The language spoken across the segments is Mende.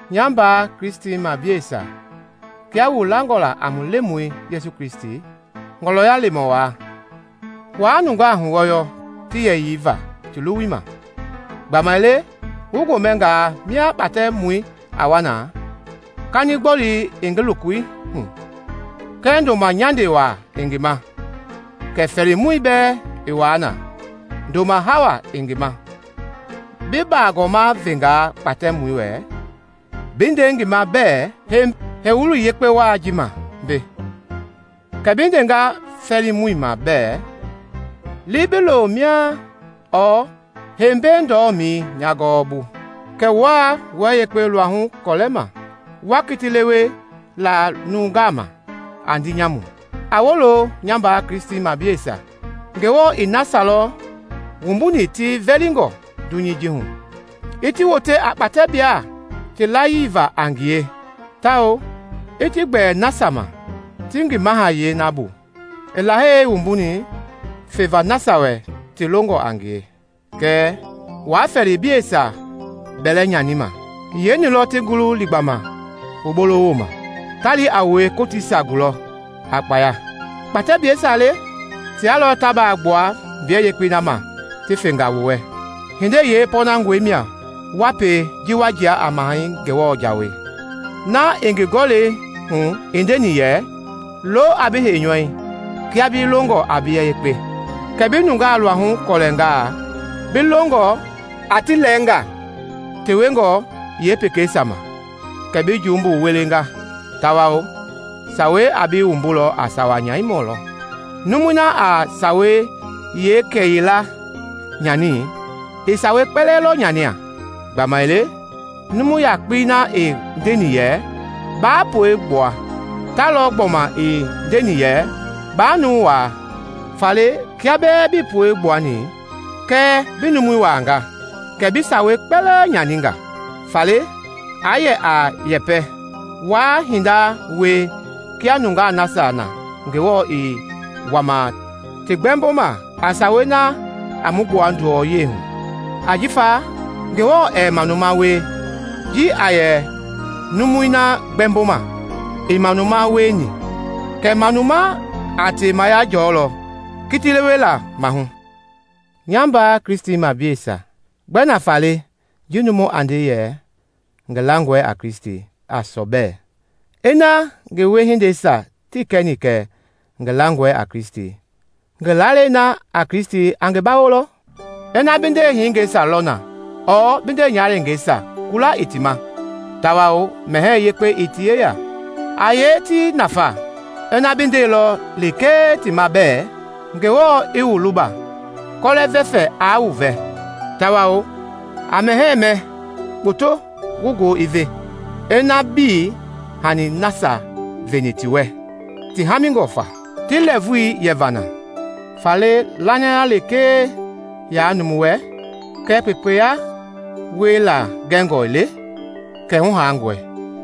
Nya mbaa Kristimableisia, kia wu langɔ a mu Lemɔi Yesu Kristi, Ngɔlɔya Lemɔ wai, waa nungaa huwɔyɔ ti yɛyii va ti luwui ma. Gbamaile wu gomɛngaa mia kpatɛmɔ a wa na, kanigbɔli i ngi lokohu kɛɛ ndoma nyande waa i ngi ma, kɛ fɛɛlimɔi bɛɛ i wa na ndoma hawei i ngi ma, bi baagɔma vengaa kpatɛmɔi wɛ bi nde ngi ma bɛɛ, “Hei heiwulii yeekpekpe wai ji ma mbei,” kɛ bi ndenga fɛɛlimɔi ma bɛɛ, “Li bi lo mia,” ɔɔ “Hei mbei ndɔmɛi nya gɔɔbu,” kɛ wua wua yekpe luahu gɔlɛma, wa kiti lewe la nungaa ma a ndii nyamui. A wolo, nya mbaa Kristimableisia! Ngewɔ i nasia lɔ wumbuni ti vɛlingɔ dunyei ji hu i ti wote a kpatɛbla ti layii va a ngie tawao i ti gbɛɛ nasia ma ti ngi mahayɛi na bu i Lahei wumbuni feva nasia wɛ ti longɔ a ngie. Kɛɛ wuaa fɛɛliblɛisia bɛlɛ nyanima. Yeeni lɔ ti ngulu liigbama wu bolowooma, ta li a wue kootiisia gulɔ a kpaya? Kpatɛblaa le! Tia lɔ ta baa gbua mbiyɛ yekpei na ma ti fenga wu wɛ. Hindei yeepɔnangɔi mia wa pie ji wa jia a Mahɛi Ngewɔ jawei na i ngi Gɔlɛi hu i ndeni yɛ, “Lo a bi heinyɔui kia bi longɔ a bia yekpe.” Kɛɛ bi nungaa luahu gɔlɛngaa, bi longɔ a ti lɛɛngaa tewengɔ yeepekeisia ma, kɛ bi jumbu wulinga tawao Sawei a bi wumbu a sawa-nyanimɔ lɔ. Numu na a Sawei yeengila nyani, i sawei kpɛlɛɛ lɔ nyanini. Gbamaile numu yakpei na i ndeni yɛ, “Baa puegbua,” ta lɔ gbɔma i ndeni yɛ, “Baa numu waa.” Faale kiaa bɛɛ bii puegbuani, kɛɛ bi numu waangaa, kɛ bi sawei kpɛlɛɛ nyaninga. Faale a yɛ a yɛpɛ, wa hinda wie kia nungei nasia na Ngewɔ i wama ti gbɛmboma a sawei na a mu gbua nduwɔyahu. Ajifa Ngewɔ ɛɛ manuma wie ji a yɛ numui na gbɛmboma ii manuma wieni; kɛɛ manuma a temaya jɔlɔ kitilewela maahu. Nya mbaa Kristimableisia, gbɛ nafa le jii numui a nde yɛ ngi langɔe a Kristi a sɔbɛ ina ngi wiehindeisia tii kɛni kɛ ngi langɔe a Kristi? Ngi lalei na a Kristi a ngi bawolɔ? Ina bi ndehingɛisia lɔ na ɔɔ bi ndenyahaleengeisia kula ii ti ma tawao mɛhɛɛ yekpe ii ti yeya; a yee ti nafa ina bi ndeilɔ lekee ti ma bɛɛ, “Ngewɔ i wu luba! Kɔlɛ-vɛfɛ aa wu vɛ tawao a mɛhɛɛ mɛ kpoto wu goo i ve!” Ina bii hanii nasia veni ti wɛ ti haamingɔ fa ti lɛɛvui yeva na? Faale lanayei lekee yaa numu wɛ kɛɛ kpekpeya wiela gɛngɔ ii le ma kɛ hu haangɔi.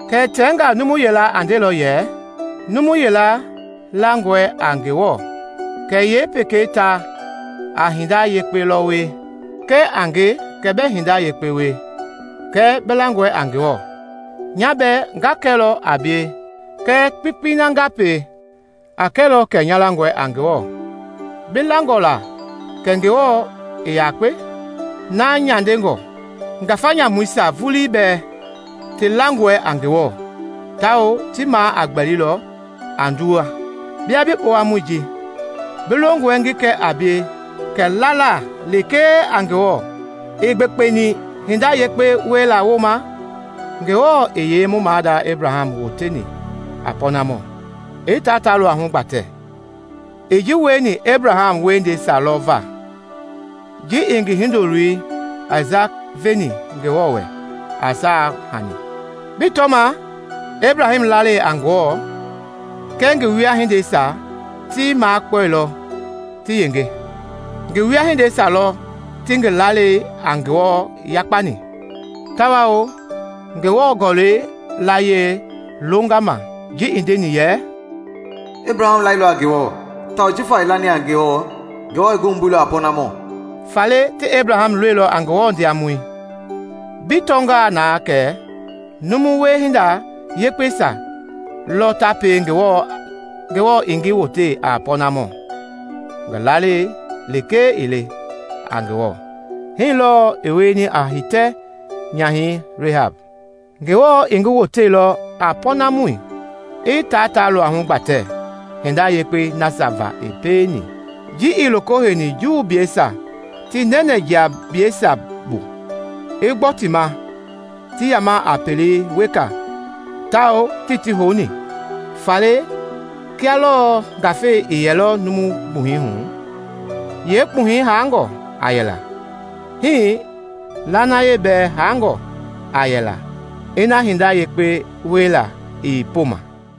Kɛɛ tɛngaa numu yila a ndelɔ yɛ, “Numu yila langɔe a Ngewɔ kɛɛ yee pekei ta a hinda yekpe lɔ wie.” Kɛ a nge kɛ bɛɛ hinda yekpe wie kɛɛ bi langɔe a Ngewɔ, nya bɛɛ nga kɛlɔ a bie kɛ kpekpei na nga pie a kɛlɔ kɛ nya langɔe a Ngewɔ. Bi langɔe la kɛ Ngewɔ i yakpe? Na nyandengɔe. Ngafa nyamuisia vulii bɛɛ ti langɔe a Ngewɔ tawao ti maa a gbɛli lɔ a nduwɛi. Bia bi kpowamɔi ji! Bi longɔe ngi kɛ a bie kɛ lala lekee a Ngewɔ ii gbekpeni hinda yekpe wiela wooma? Ngewɔ i yee mu maada Ebraham woteni a pɔɔnamɔ, i tia ta luahu gbatɛ? I ji wieni Ebraham wiehindeisia lɔ va, ji i ngi hindoloi Aisaki veni Ngewɔ wɛ a saai hani. Bii tɔma? Ebraham layii a Ngewɔ kɛɛ ngi wiehindeisia ti makpɔilɔ ti yenge; ngi wiehindeisia lɔ ti ngi lalei a Ngewɔ yakpani. Tawao Ngewɔ Gɔlɛi layie i longa ma ji i ndeni yɛ, “Ebraham lailɔ a Ngewɔ, tawao jifa i lani a Ngewɔ, Ngewɔ i ngi wumbuilɔ a pɔɔnamɔ.” Faale ti Ebraham loliilɔ a Ngewɔ ndiamɔ. Bi tɔnga na kɛ numu wiehinda yekpeisia lɔ ta pie Ngewɔ i ngi wote a pɔɔnamɔ, ngi lalei lekee ii le a Ngewɔ. Hii lɔɔ i wieni a hitɛ-nyahɛi Rehab. Ngewɔ i ngi woteilɔ a pɔɔnamɔ, i taa ta luahu gbatɛ hinda yekpei nasia va i pieni ji i loko heini Juubleisia ti nɛnɛjiagablɛisia bu, i gbɔ ti ma ti yama a pele weka tawao tii ti houni. Faale le kia lɔɔ ngafei ii yɛlɔ numu gbuhɛi hu yeekpuhɛi haangɔ a yɛla, hii lanaya bɛɛ haangɔ a yɛla ina hinda yekpe wiela ii pooma.